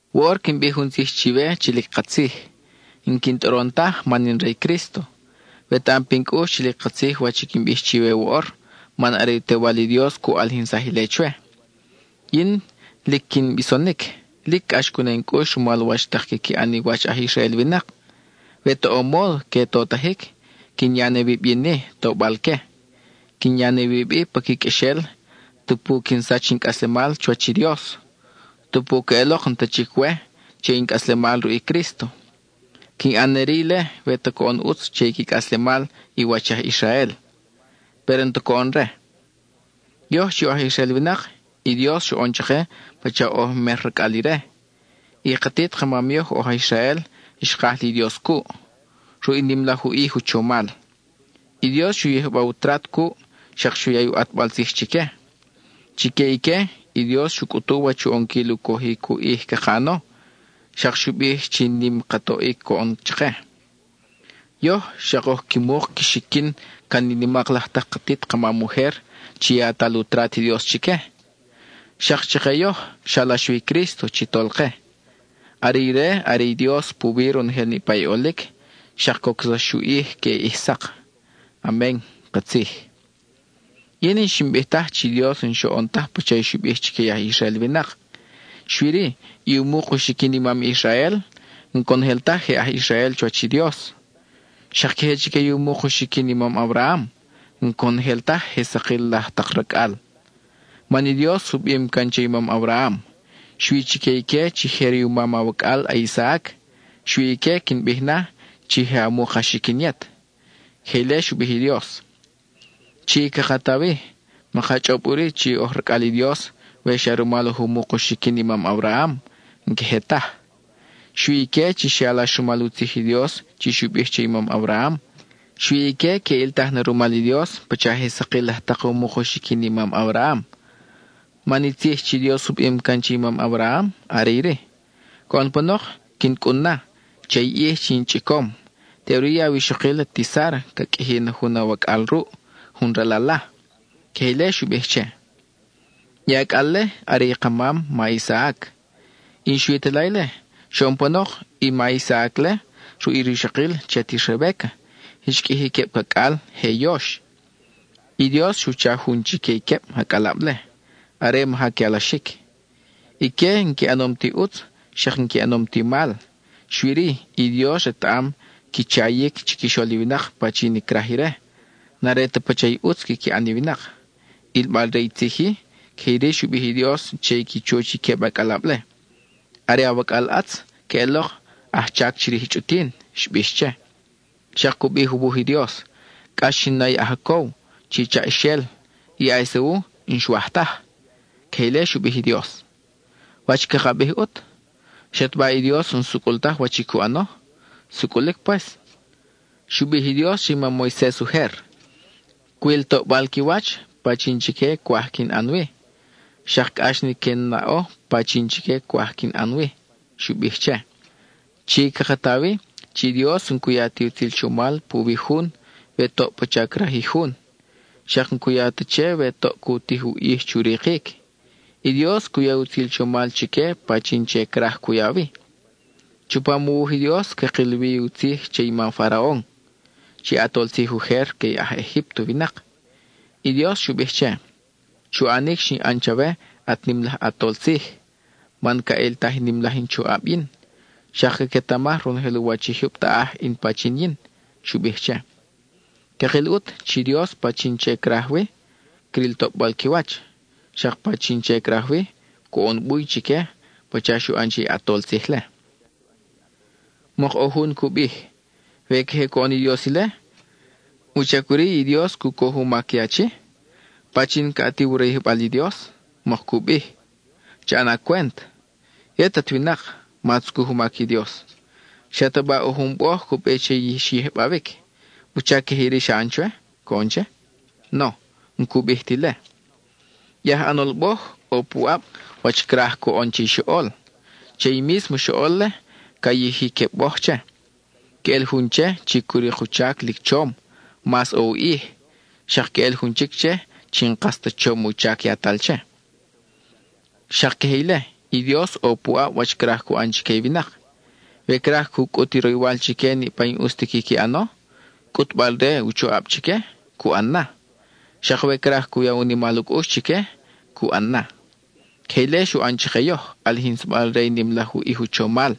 Woʼor quin bij jun tzij chiwe chi lic katzij; n-quin tʼoron taj man in re i Crísto. Wetaʼam pin cʼux chi lic katzij wach i quin bij chiwe woʼor man are i u Tewal i Dios cu ʼalijinsaj ile chwe. Yin, lic quin bisonic, lic cʼax cu na in cʼux rumal wach tak quiqui ʼan i wach aj Israel winak. We ta ʼo módo que totajic, quin ya ne wib yin-i tobal-que; quin ya ne wib-i pa qui qʼuexel tupu quin sach in cʼaslemal chuwach i Dios, tupu queʼelok n-ta chic we che in cʼaslemal ruʼ i Crísto. Quin ʼan ne-ri ile we ta coʼon ʼutz che i qui cʼaslemal i wach aj Israel, péro n-ta coʼon re. Yoj chi oj aj Israel winak, i Dios xoʼon chake pacha oj mer racʼal ire. I katit ka mam yoj oj aj Israel xkaj li Dios cuʼ, ruʼ i nim laj u ʼij u chomal. I Dios xu yijba u trat cuʼ, xak xu ya i u ʼatbal tzij chique. Chique ique, i Dios xu cʼutu wach u ʼonquil u cojic u ʼij caka ʼano; xak xu bij chi nim ka toʼic coʼon chake. Yoj, xak oj qui muk qui xiquin can i nimak laj tak katit ka mam ujer chi yatal u trat i Dios chique; xak chake yoj, xalax wi i Crísto chi Tolke. Are ire are i Dios puwi ronojel niʼpa i ʼolic, xak cocsax u ʼij queʼe ʼij sak. Amen (katzij). Yin n-xin bij taj chi Dios n-xoʼon taj pacha i xu bij chique i aj Israel winak. Xui-ri, i u muk u xiquin i mam Israel, n-conojel taj je aj Israel chuwach i Dios. Xak queje chique i u muk u xiquin i mam Abraham, n-conojel taj je sakil laj tak racʼal. Man i Dios u bim can che i mam Abraham: “Xui chique ique chi je riumam awacʼal a-Isaac, xui ique quin bij na, chi je a muk a xiquin yet.” (Queje ile xu bij i Dios.) Chi, caka ta wi, maka chʼob ʼuri chi oj racʼal i Dios we xa rumal oj u muk u xiquin i mam Abraham, n-queje taj. Xui ique chi xe alax rumal u tzij i Dios chi xu bij che i mam Abraham, xui ique que ʼiltaj na rumal i Dios pacha je sakil laj tak u muk u xiquin i mam Abraham. Man i tzij chi Dios u bim can che i mam Abraham are iri: “Coʼon panok quin cʼun na, che i ʼij chi in chʼicom, teʼuri i awixokil ati Sára ca qʼuiji na jun awacʼal ruʼ, jun ral ala.” (Queje ile xu bij che.) I acʼal-le are i ka mam, ma Isaac. Y n-xui ta la ile; xoʼon panok, i ma Isaac-le, ruʼ i rixokil chi ati Rebéca, xqʼuiji queb cacʼal, je yox. I Dios xu cha jun chique i queb acʼalab-le are maja que alaxic. Ique, n-qui ʼanom ti ʼutz, xak n-qui ʼanom ti mal, xui-ri, i Dios retaʼam qui chayic chiquixol i winak pachin i craj ire; n-are ta pacha i ʼutz quiqui ʼan i winak. ʼIlbal re i tzij-i, queje iri xu bij i Dios che i qui chuch i queb acʼalab-le: “Are awacʼal ʼatz, queʼelok ajchac chirij i chʼutin,” xbix che. Xak cu bij u wuj i Dios: “Cʼax xin na i a-Jacob, chi chaʼaxel; i a-Esau n-xwaj taj”. (Queje ile xu bij i Dios.) ¿Wach caka bij, ʼut? ¿Xataba i Dios n-sucʼul taj wach i cu ʼano? ¡Sucʼulic pues! Xu bij i Dios che i mam Moises ujer: “Cwil toʼbal qui wach pachin chique cwaj quin ʼan wi, xak cʼax ni que in naʼo pachin chique cwaj quin ʼan wi,” xu bij che. Chi caka ta wi chi Dios n-cu ya ti utzil chomal puwi jun we toʼ pacha craj i jun; xak n-cu ya ta che we toʼ cu tij u ʼij chu rikic. I Dios cu ya i utzil chomal chique pachin che craj cu ya wi. Chupam u wuj i Dios cakil wi u tzij che i ma Faraon, chi ʼatol tzij ujer que i aj Egípto winak. I Dios xu bij che: “Chu ʼanic xin ʼan chawe at nim laj ʼatol tzij, man ca ʼiltaj i nim laj in choʼab yin, xak caquetamaj ronojel u wach i jyub taʼaj in pachin yin,” xu bij che. Cakil ʼut chi Dios, pachin che craj wi, cril toʼbal qui wach; xak pachin che craj wi, coʼon buy chique pacha xu ʼan che i ʼatol tzij-le. Mok ʼo jun cu bij: “We queje coʼon i Dios ile ¿wuchac ʼuri i Dios cu coj u mac i achi? ¿Pachin ca ʼatiw u rayijbal i Dios?” mok cu bij. ¡Cha ʼana cwent! Yet at winak, ma tzucuj u mac i Dios. ¿Xataba ʼo jun boj cu bij che i xyijbawic: “¿Wuchac queje iri xa ʼan chwe?” coʼon che? No, n-cu bij ti ile. I aj ʼanol boj, ʼo puʼab wach craj coʼon che i xoʼol. Che i mísmo xoʼol-le, ca yiji queb boj che. Quel jun che, chi cu rik u chac lic chom, mas ʼo u ʼij; xak quel jun chic che, chi n-kas ta chom u chac yatal che. Xak queje ile i Dios, ʼo puʼab wach craj cu ʼan chique i winak. We craj cu cʼut i roywal chique niʼpa i n-ʼus ti quiqui ʼano, cʼutbal-re u choʼab chique, cu ʼan na. Xak we craj cu ya u nimal u cʼux chique, cu ʼan na. Queje ile xu ʼan chake yoj, ʼalijinsabal re i nim laj u ʼij u chomal.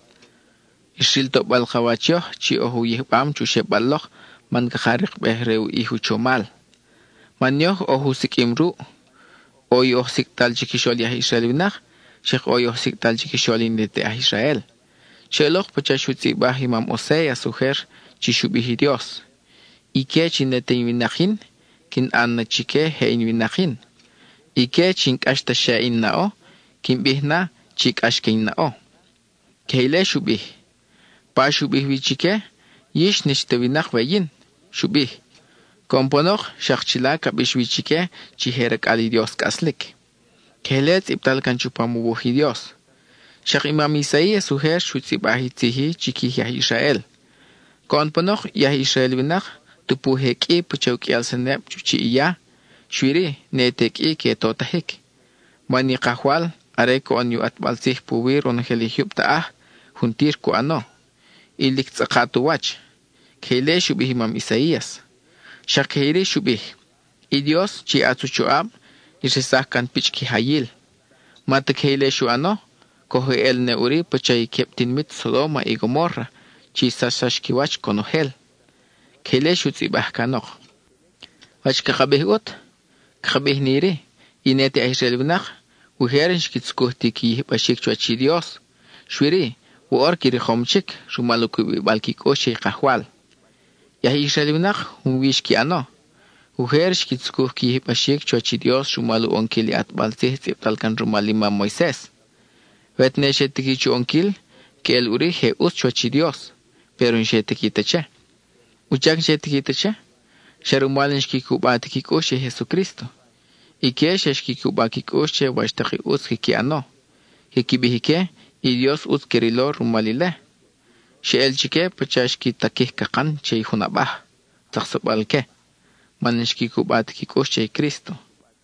Xril toʼbal ka wach yoj chi oj u yijbam chu xebal lok man caka rikbej re u ʼij u chomal. Man yoj oj u siqʼuim ruʼ. ʼO i oj sicʼtal chiquixol i aj Israel winak, xak ʼo i oj sicʼtal chiquixol i ne te aj Israel. Xeʼelok pacha xu tzʼibaj i mam Oséas ujer chi xu bij i Dios: Ique chi ne te in winak yin, quin ʼan na chique je in winak yin; ique chi n-cʼax ta xe in naʼo, quin bij na chi cʼax na que in naʼo. (Queje ile xu bij.) Pa xu bij wi chique: “Yix n-ix ta winak we yin,” xu bij, coʼon panok, xak chila ca bix wi chique chi je racʼal i Dios cʼaslic. (Queje ile tzʼibtal can chupam u wuj i Dios.) Xak i mam Isaías ujer xu tzʼibaj i tzij-i chiquij i aj Israel: “Coʼon panok, i aj Israel winak, tupu je qʼui pacha u qʼuial seneb chu chiʼ i ya, xui-ri, ne te qʼui que totajic, man i Kajwal are coʼon ni u ʼatbal tzij puwi ronojel i jyub taʼaj, juntir cu ʼano, y lic tzʼakat u wach.” (Queje ile xu bij i mam Isaías.) Xak queje iri xu bij: I Dios, chi ʼatz u choʼab, xresaj can pichʼ kijayil; ma ta queje ile xu ʼano, coj eʼel ne ʼuri pacha i queb tinimit Sodóma y Gomórra chi xsachsax qui wach conojel. (Queje ile xu tzʼibaj canok.) ¿Wach caka bij ʼut? Caka bij na iri: i ne te aj Israel winak, ujer n-xqui tzucuj ti qui yijbaxic chuwach i Dios, xui-ri, woʼor qui rikom chic, rumal u cubibal qui cʼux che i Kajwal. I aj Israel winak junwi xqui ʼano. Ujer xqui tzucuj qui yijbaxic chuwach i Dios rumal u ʼonquil i ʼatbal tzij tzʼibtal can rumal i mam Moises. We tene xe tiqui chu ʼonquil, que ʼel ʼuri je ʼutz chuwach i Dios, péro n-xe tiqui ta che. ¿Wuchac n-xe tiqui ta che? Xa rumal n-xqui cuba ti qui cʼux che i Jesucrísto. Ique xa xqui cuba qui cʼux che wach tak i ʼutz quiqui ʼano. Quiqui bij ique, i Dios ʼutz que rilo rumal ile. Xeʼel chique pacha xqui taquij cakan che jun abaj, tzaksabal que, man n-xqui cuba ti qui cʼux che i Crísto.